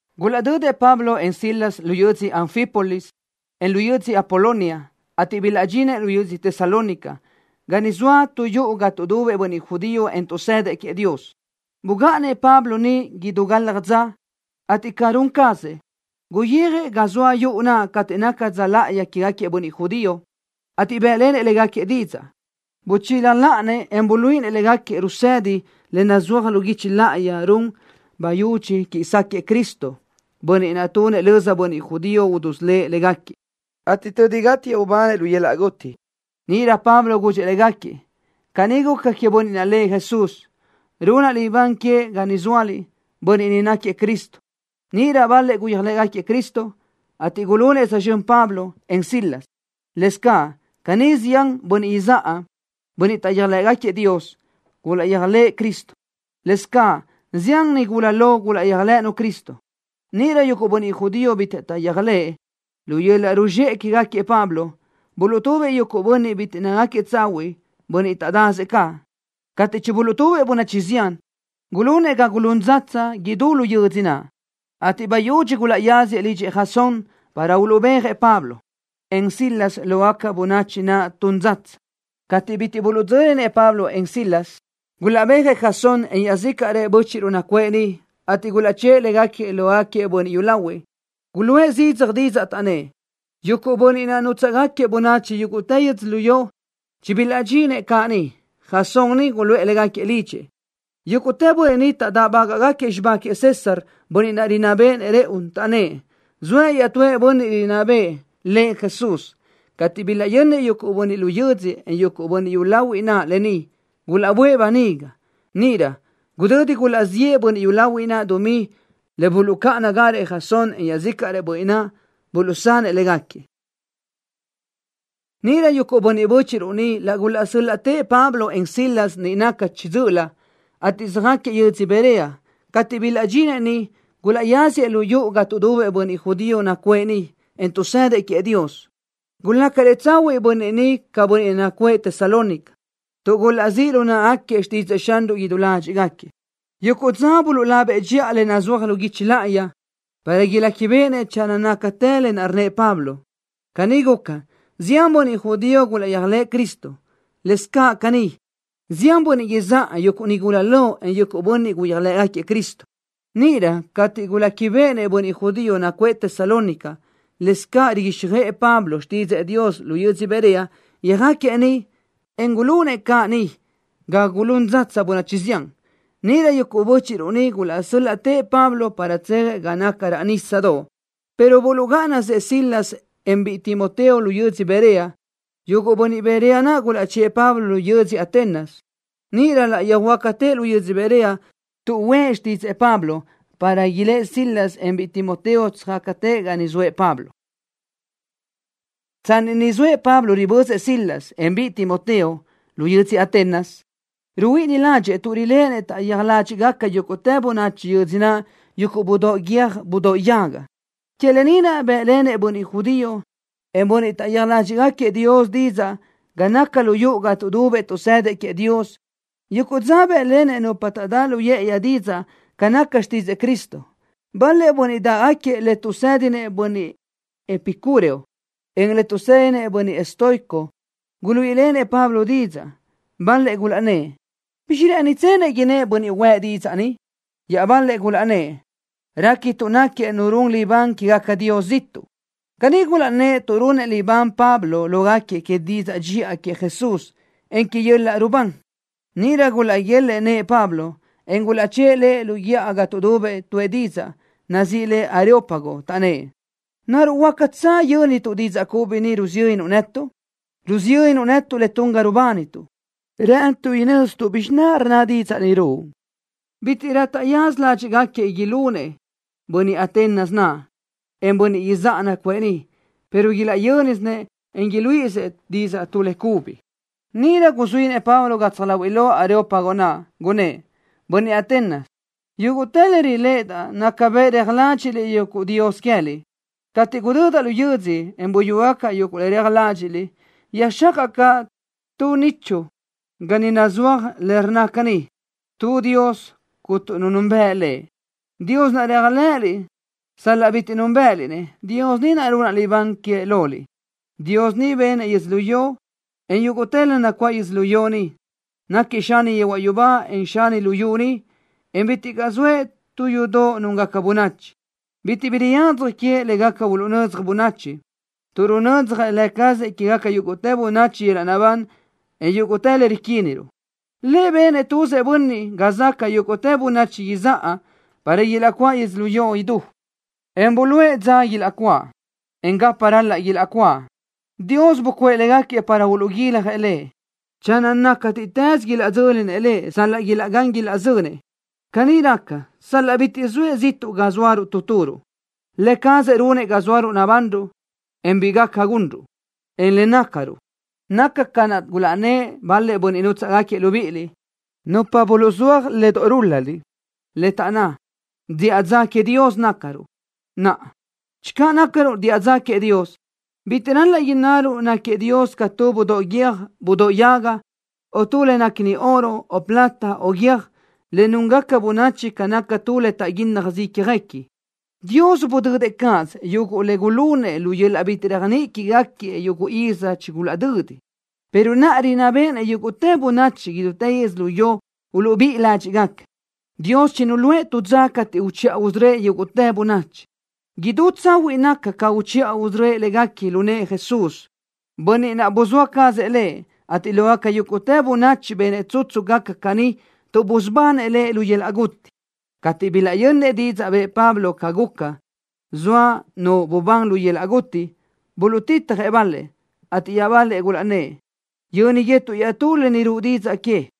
Gulaʼdödëʼ Pablo, en Silas lu yödzö Anfípolis, en lu yödzö Apolonia, ateʼ bilaʼdxinëʼ lu yödzö Tesalónica, ga niʼ zoa tu yuʼu ga tuʼdubëʼ bönniʼ judío, en tuʼsëdëʼ queëʼ Dios. Bugáʼanëʼ Pablo niʼ idú galaj dza, ateʼ ca run cazëʼ, guyijëʼ ga zoa yuʼu naʼ cateʼ naca dza láʼayi quégaquiëʼ bönniʼ judío, ateʼ bë́ʼlenëʼ légaquiëʼ didzaʼ. Buchila láʼanëʼ, en buluíʼinëʼ légaquiëʼ rusëdi le nazúaj lu guichi láʼayi run bayudxi quiʼi sáquëʼë Cristo, Bönniʼ naʼ tunëʼ löza bönniʼ judío udusölë́ʼ légaquiëʼ, ateʼ tödi gátiëʼ ubanëʼ lu yöl-laʼ guti. Níʼirö Pablo gudxëʼ légaquiëʼ: —¡Caní guca queëʼ bönniʼ naʼ lëʼ Jesús, runaʼ libán queëʼ ga ni zóaliʼ! ¡Bönniʼ ni náquiëʼ Cristo! Níʼirö bal-lëʼ gulaʼyéajlëʼë Cristo, ateʼ gulunëʼ tsözxö́n Pablo, en Silas. Lëscaʼ caní zián bönniʼ izáʼa, bönniʼ taʼyéaj ládxiʼgaquiëʼ Dios, gulaʼyéajlëʼë Cristo. Lëscaʼ zián nigula lo gulaʼyéajlëʼënu Cristo. Níʼirö yuguʼ bönniʼ judío bitiʼ taʼyéajlëʼë, lu yöl-laʼ ruzxéʼe quégaquiëʼ Pablo, buluʼtubëʼ yuguʼ bönniʼ bitiʼ nácagaquiëʼ tsahuiʼ, bönniʼ taʼdasëʼ caʼ. Cateʼ chibuluʼtúbëʼ bönachi zián, gulunëʼ ga gulún dzatsa idú lu yödzö naʼ, ateʼ bayudxi gulaʼyáziëʼ lidxëʼ Jasón para uluʼbéajëʼ Pablo, en Silas lógaca bönachi naʼ tun dzatsa. Cateʼ bitiʼ buluʼdzö́linëʼ Pablo, en Silas, gulaʼbéajëʼ Jasón, en iaʼzícaʼrëʼ bö́chiʼruʼ nacuʼë niʼ, ateʼ gulaʼchë́ʼë légaquiëʼ lógaquiëʼ bönniʼ yúlahuiʼ. Guluʼë zidzaj didzaʼ, taʼnnë́ʼ: —Yuguʼ bönniʼ naʼ nutsáʼgaquiëʼ bönachi idútë yödzölió chibilaʼdxinëʼ caʼ ni. Jasón ni guluʼë légaquiëʼ lidxëʼ. Yúguʼtë bönniʼ ni taʼdáʼbaguëʼë xibá queëʼ César, bönniʼ rinná béʼenëʼ rëʼu, taʼnnë́ʼ: “Zoëʼ iaʼtúëʼ bönniʼ rinná bëʼë, lëʼ Jesús.” Cateʼ bilaʼyönnëʼ yuguʼ bönniʼ lu yödzö, en yuguʼ bönniʼ yúlahuiʼ naʼ lë ni, gulaʼböʼë böniga. Níʼirö, gudödi gulaʼziʼë bönniʼ yúlahuiʼ dumí le buluʼcáʼanagarëʼ Jasón, en iaʼzícaʼrëʼ bönniʼ naʼ, buluʼsanëʼ légaquiëʼ. Níʼirö yuguʼ bö́chiʼruʼ niʼ laʼ gulaʼsö́l-laʼtëʼ Pablo, en Silas, niʼ naca chiʼi dzö́ʼölö, ateʼ söjáquiëʼ yödzö Berea. Cateʼ bilaʼdxinëʼ niʼ, gulaʼyáziëʼ lu yuʼu ga tuʼdubëʼ bönniʼ judío nacuʼë niʼ, en tuʼsëdëʼ queëʼ Dios. Gulácarëʼ tsahuiʼ bönniʼ ni ca bönniʼ nacuʼë Tesalónica, tuʼ gulaʼzíʼ lu náʼagaquiëʼ xtídzëʼë Xanruʼ idú ládxiʼgaquiëʼ. Yuguʼ dza buluʼlabëʼ dxiʼa le nazúaj lu guichi láʼayi, para iléquibeʼenëʼ channö nácatë lë naʼ rnnëʼ Pablo. Caní guca, zián bönniʼ judío gulaʼyéajlëʼë Cristo. Lëscaʼ caní, zián bönniʼ izáʼa, yuguʼ nigula lo, en yuguʼ bönniʼ gulaʼyéajlëʼë Cristo. Níʼirö cateʼ guléquibeʼenëʼ bönniʼ judío nacuʼë Tesalónica, lëscaʼ riguíxjöʼë Pablo xtídzëʼë Dios lu yödzö Berea, yöjáquiëʼ niʼ, en gulunëʼ caʼ niʼ ga gulún dzatsa bönachi zián. Níʼirö yuguʼ bö́chiʼruʼ niʼ laʼ gulaʼsö́l-laʼtëʼ Pablo, para tsejëʼ ga naca raʼ nísadoʼ, pero buluʼgáʼanasëʼ Silas, en biʼi Timoteo lu yödzö Berea. Yuguʼ bönniʼ Berea naʼ gulaʼchë́ʼë Pablo lu yödzö Atenas. Níʼirö laʼ yöjhuö́jgacatëʼ lu yödzö Berea, tuʼúʼë xtídzëʼë Pablo, para ilë́ʼ Silas, en biʼi Timoteo, tsöjácatëʼ ga niʼ zoëʼ Pablo. Tsanni niʼ zoëʼ Pablo ribözëʼ Silas, en biʼi Timoteo, lu yödzö Atenas, ruhuíʼini ládxëʼë tuʼ riléʼenëʼ taʼyéaj ládxiʼgaca yúguʼtë bönachi yödzö naʼ yuguʼ budóʼ guiö́j budóʼ yaga. Que lë ni naʼ bë́ʼlenëʼ bönniʼ judío, en bönniʼ taʼyéaj ládxiʼgaquiëʼ Dios didzaʼ ga naca lu yuʼu ga tuʼdubëʼ tuʼsëdëʼ queëʼ Dios. Yuguʼ dza bë́ʼlenëʼ nupa taʼdá lu yë́ʼëyi didzaʼ ca naca xtídzëʼë Cristo. Bal-lëʼ bönniʼ dáʼgaquiëʼ le tuʼsë́dinëʼ bönniʼ epicúreo, en le tuʼsë́dinëʼ bönniʼ estoico guluíʼilenëʼ Pablo didzaʼ. Bal-lëʼ gulaʼnnë́ʼ: —¿Bizxi rë́ʼënitsenëʼ innë́ʼ bönniʼ huëʼ didzaʼ ni? Iaʼbal-lëʼ gulaʼnnë́ʼ: —Réquituʼ náquiëʼ nu run libán quégaca dios ziʼtuʼ. Caní gulaʼnnë́ʼ tuʼ runëʼ libán Pablo lógaquiëʼ que didzaʼ dxiʼa queëʼ Jesús, en que yöl-laʼ rubán. Níʼirö gulaʼguélëʼë nëʼë Pablo, en gulaʼchë́ʼë lëʼ lu guíʼa ga tuʼdubëʼ tuʼë didzaʼ, nazíʼi le Areópago, taʼnnë́ʼ: —¿Naruʼ huácatsö yö́nituʼ didzaʼ cubi ni rusiyönnuʼ netuʼ? Rusiyönnuʼ netuʼ le tun ga rubánituʼ. Rë́ʼënituʼ inö́zituʼ bizxi rnna didzaʼ ni ruʼu. Bítiʼrö taʼyaza ládxiʼgaquiëʼ ilunëʼ bönniʼ Atenas naʼ, en bönniʼ izáʼa nacuʼë niʼ, pero ilaʼyö́nisinëʼ, en iluíʼisëʼ didzaʼ tu le cubi. Níʼirö guzuínëʼ Pablo gatsaj láhuiʼlö löʼa Areópago naʼ, gunnë́ʼ: —Bönniʼ Atenas, yúguʼtë le riléʼedaʼ naca bëʼ reaj ládxiʼdaʼaliʼ yuguʼ dios queë́liʼ. Cateʼ gudödaʼ lu yödzö, en buyúgacaʼ yuguʼ le reaj ládxiʼliʼ, yöjxácaʼa caʼ tu nichu ga niʼ nazúaj le rnna caní: “Tu Dios, Cuntu Nu Nunbëʼ Lëʼ.” Dios naʼ reaj ládxiʼliʼ-nëʼ sal-laʼ bitiʼ núnbëʼëliʼ-nëʼ, Dios ni runaʼ libán queëʼ loliʼ. ’¡Dios ni benëʼ yödzölió, en yúguʼtë le nacuáʼ yödzölió ni! ¡Náquiëʼ Xani yehuaʼ yubá, en Xani luyú ni, en bitiʼ caʼ zoëʼ tu yudoʼ núngaca bönachi! Bitiʼ bi riyadzaj queëʼ le gaca uluʼnödzaj bönachi, tuʼ runödzjëʼ Lë cazëʼ quégaca yúguʼtë bönachi yöl-laʼ naʼbán, en yúguʼtë le riquíniruʼ. ’Lëʼ benëʼ tuzëʼ bönniʼ ga záʼgaca yúguʼtë bönachi izáʼa para ilaʼcuáʼ idú yödzölió, en buluʼe dza ilaʼcuáʼ, en gapa ral-laʼ ilaʼcuáʼ. Dios bucuʼë légaquiëʼ para uluʼguiljëʼ Lëʼ, channö nácatiʼtës ilaʼdzö́linëʼ Lëʼ sal-laʼ ilaʼgán ilaʼzönsëʼ. Caní raca sal-laʼ bitiʼ zoëʼ ziʼtuʼ ga zóaruʼ tu turuʼ. Lë cazëʼ runëʼ ga zóaruʼ nabanruʼ, en bi gaca gunruʼ, en le nácaruʼ. Naca ca naʼ gulaʼnnë́ʼ bal-lëʼ bönniʼ nútsaʼgaquiëʼ libíʼiliʼ, nupa buluʼzúaj le doʼ rúl-laliʼ, le taʼnná: “Diʼa dza queëʼ Dios nácaruʼ.” Naʼa, channö nácaruʼ diʼa dza queëʼ Dios, bitiʼ ral-laʼ innaruʼ náquiëʼ Dios ca tu budóʼ guiö́j budóʼ yaga, o tu le néquini oro, o plata, o guiö́j, le núngaca bönachi ca naca tu le taʼguínnajsö ícjaguequi. Dios budödëʼ cáʼasö yuguʼ le gulunëʼ lu yöl-laʼ bitiʼ réajniʼi quégaquiëʼ yuguʼ iz chigulaʼdödi, pero naʼa rinná béʼenëʼ yúguʼtë bönachi idútë yödzölió uluʼbíʼi ládxiʼgaca. Dios chinuluʼë tu dza cateʼ uchiʼa usörö́ëʼ yúguʼtë bönachi. Idú tsahuiʼ naca ca uchiʼa usörö́ëʼ légaquiëʼ lu nëʼë Jesús, bönniʼ naʼ buzóa cazëʼ Lëʼ, ateʼ lógaca yúguʼtë bönachi benëʼ tsutsu gaca caní tuʼ busubanëʼ Lëʼ lu yöl-laʼ guti. Cateʼ bilaʼyönnëʼ didzaʼ bëʼë Pablo ca guca, zoa nu bubán lu yöl-laʼ guti, buluʼtitjëʼ bal-lëʼ, ateʼ iaʼbal-lëʼ gulaʼnnë́ʼ: —Yö́niguetuʼ iaʼtú lë ni ruʼu didzaʼ que.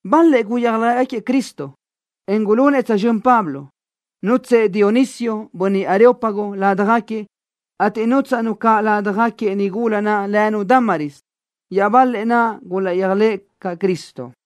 Bal-lëʼ gulaʼyéajlëʼë Cristo, en gulunëʼ tsözxö́n Pablo. Nútsëʼë Dionisio, bönniʼ areópago, ládjagaquiëʼ, ateʼ nútsaʼnu caʼ ládjagaquiëʼ nigula naʼ lënu Dámaris. Iaʼbal-lëʼ naʼ gulaʼyéajlëʼë caʼ Cristo.